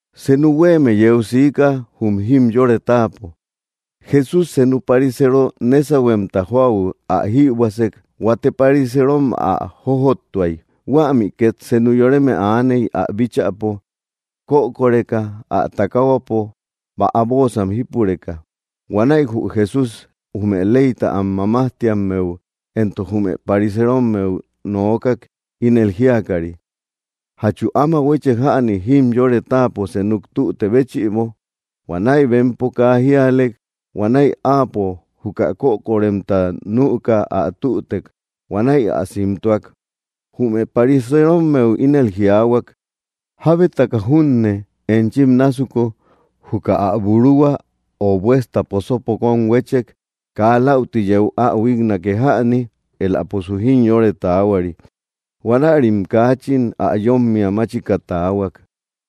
Senu huéeme yeu siika, jum jimyore táapo. Jesús senu pariseero nésahuemta jóau ä jïbuäsek. Huate pariseerom ä jojottuay. Huämi két senu yoreme aaney, ä bíchäpo kökoreka, ä takahuapo bäa bóosam jípureka. Huanäi jü Jesús jume leyta am mamajtiammeu éntok jume pariserommeu nookak, ínel jíakari: —¿Jachu áma huéche jäni jimyore táapo senuk tüte béchïbo? Huanäi bempo kaa jíalek. Huanäi áapo, juka kökoremta nüka, ä tütek. Huanäi ä simtuak. Jume pariserommeu ínel jiaahuak: —¿Jábetaka junne, enchim násuku, juka ä buruhua o buesta posopo kóm huétchek, kaa läuti yeu ä huíknake jäni? Éläposu jimyore taahuari. Huanärim kaachin ä yómmia máchika taahuak.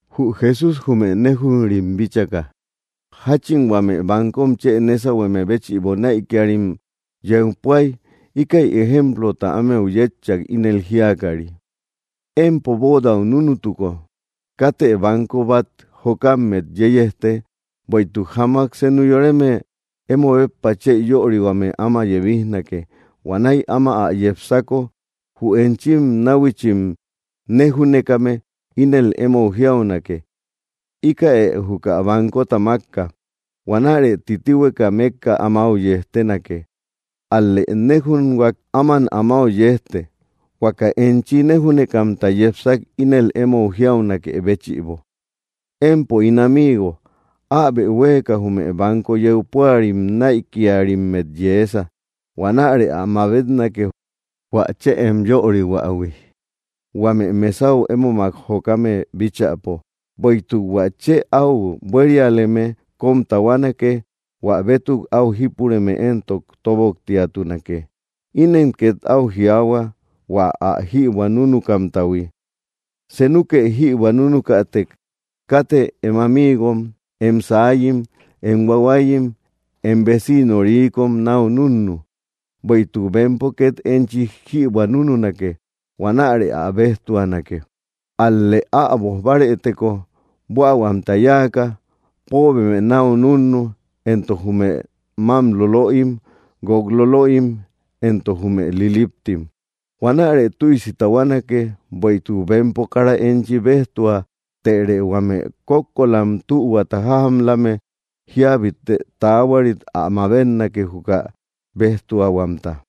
Jü Jesús jume néjunrim bíchaka jáchin huame bankom chë nésahueme béchïbo näikiarim yeu púay, íkäi ejemplota ámeu yétchak, ínel jíakari: —Empo bóodau núnutuko, katë banko bát jokammet yeyejte, bueïtuk jamak senu yoreme emo béppa chë yörihuame áma yebijnake. Huanäi áma ä yepsako jü enchim náhuichim néjúnekame ínel émou jiaunake: “Íkäe júkäi bankota mákka.” Huanäre titihueka mékka amáu yejtenake. Ál‑lë néjunhuak, áman amáu yejte, huaka enchi néjúnekamta yepsak ínel émou jiaunakë béchïbo: “Empo ín amigo, äbe huéeka jume banko yeu púarim näikiarimmet yeesa.” Huanärë ä mabetnake, hua chë em yörihuähui, huame mesau émomak jokame bíchäpo. Bueïtuk hua chë áu buérialeme kóm tahuanake, hua bétuk áu jípureme éntok tóboktiatunake. Inen két áu jiaahua hua ä jïbuä núnukamtahui: —Senukë jïbuä núnukätek, katë em amiigom, em saayim, em huahuayim, em veciino rikom náu núnnu, bueïtuk bempo két enchi jïbuä núnunake. Huanärë ä béjtuatunake. Ál‑lë äboj bárëteko buähuamta yáaka, póobeme náu núnnu, éntok jume mám lolöim, guók lolöim, éntok jume liliptim. Huanärë tüisi tahuanake, bueïtuk bempo kara enchi béjtua. Tërë huame kókkolam tühuata jájamlame jíabite taahuarit ä mabetnake, juka béjtuahuamta.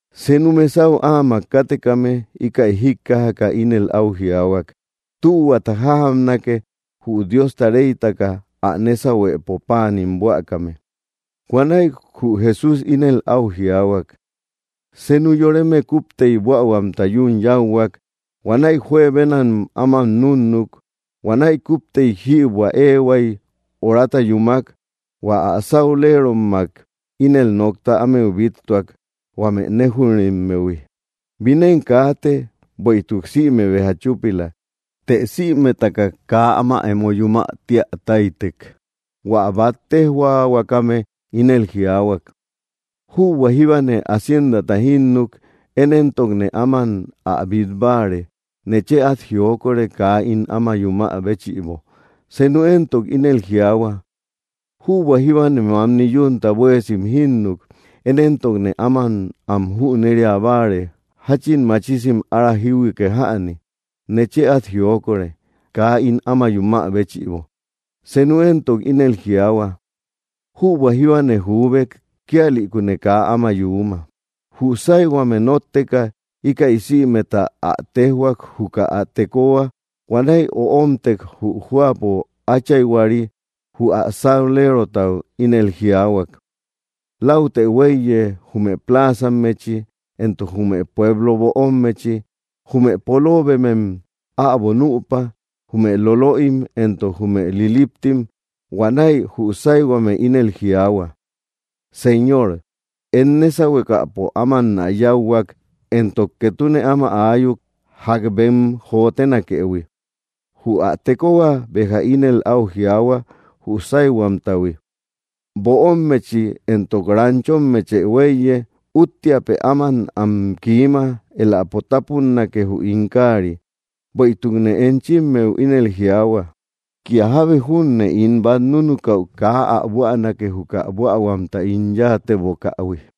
Senu mesau áamak kátekame íkäi jíkkajaka, ínel áu jiaahuak: —Tühuata jájamnake jü Diosta reytaka ä nésahuepo páanim buäkame. Huanäi jü Jesús ínel áu jiaahuak: —Senu yoreme kúptey buähuamta yún yáuhuak. Huanäi juebenam áman núnnuk. Huanäi kúptey jïbuä éehuay horata yúmak, hua ä sáulerommak ínel nokta ámeu bíttuak, huame néjunrimmehui: ‘‘Binen kaate, bueïtuk sïme béja chúpila.” Të sïmetaka kaa áma emo yumä tía táytek. Huä bát téjhuaahuakame ínel jiaahuak: ‘‘Jübua jíbane haciendata jínnuk. Én éntokne áman ä bít báare. Nechë át jiokore, kaa ín áman yumä béchïbo.” Senu éntok ínel jiaahua: ‘‘Jübua jíbane mamni yúnta buéesim jínnuk. Én éntokne áman am jüneria báare jáchin machisim ára jíhuike jäni. Nechë át jiokore, kaa ín áma yumä béchïbo.” Senu éntok ínel jiaahua: “Jübua jíbane juubek; kíalïkune kaa áma yuuma.” Jü sáyhuame nótteka, íkäi sïmeta ä téjhuak, juka ä tekohua. Huanäi öomtek, jü jóapo áchayhuari; jü ä saulerotau ínel jiaahuak: ‘‘Läutë huéiye jume pláazammechi éntok jume pueblo böommechi. Jume poloobemem äbo nüpa, jume lolöim éntok jume liliptim.” Huanäi jü sáyhuame ínel jiaahua: ‘‘Señor, em nésahuekäpo ámannä yáuhuak, éntok ketune áma aayuk, ják bem jotenakëhui.” Jü ä tekohua béja ínel áu jiaahua jü sáyhuamtahui: ‘‘Böommechi éntok ranchommechë huéiye. Úttiapë áman am kiima, éläpo tápunnake jü ín káari. Bueïtukne enchimmeu ínel jiaahua, kía jábe júne ín bát núnukäu kaa ä buänake, juka buähuamta ín yáatebokähui.”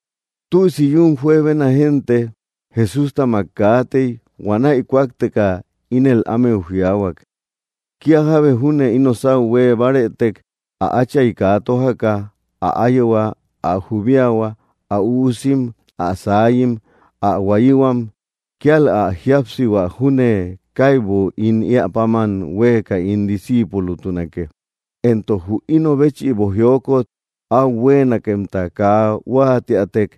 Tüisi yún juebena génte Jesústamak kaatey. Huanäi kúakteka ínel ámeu jiaahuak: —Kía jábe júne ino sáu huée bárëtek, ä átchay kaa tójaka, ä áyehua, ä jubiahua, ä üusim, ä saayim, ä huáyihuam, kíal ä jíapsihua junne, kaibu ín éä páman huéeka ín disciipulotunake. Éntok jü ino béchïbo jiokot aú huemakemta kaa huatiatek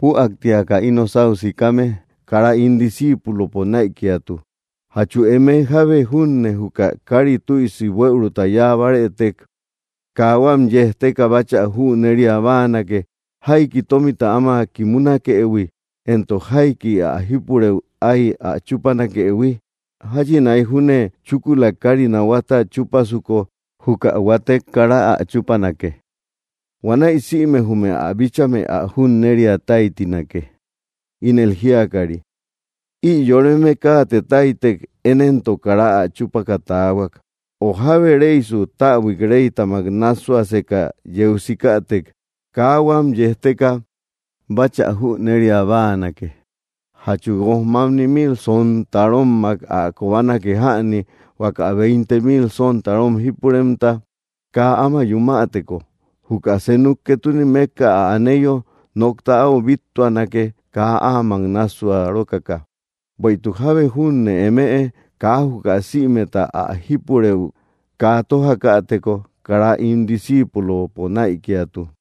püaktiaka ino sáu sikame, kara ín disciipulopo näikiatu. Jachu eme jábe júne juka kári tüisi buëuruta yáa bárëtek kaa huam yejteka báchä jüneria báanake, ¿jaiki tómita áma kimunakëhui, éntok jaikik ä jípurëu ái ä chúpanakëhui? Jáchinaik junne, chúkula kári nahuata chúpasuko, juka huatek kara ä chúpanake. Huanäi sïme jume ä bíchame ä junneria táytinake, ínel jíakari: ‘‘Ï yoreme káate táytek; én éntok kara ä chúpaka taahuak.” O jábe reysu, täbui reytamak nássuaseka yeu sikätek, ¿kaa huam yejteka báchä jüneria báanake? ¿Jachu guojmamni mil sontarommak ä kobanake jäni, huaka veinte mil sontarom jípuremta? Kaa áma yumäteko, juka senuk ketune mékka ä aneyo, nokta áu bíttuanake kaa áamak nássua rókaka. Bueïtuk jábe junne eme kaa juka sïmeta ä jípurëu kaa tójäteko, kara ín disciipulopo näikiatu.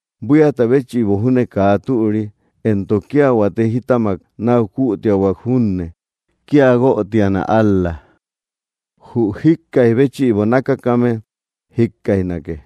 Buíata béchïbo júne kaa türi, éntok kía huate jítamak náu kuutiahuak junne, kía guötiana ál‑la. Jü jíkkaij béchïbo nákakame jikkaijnake.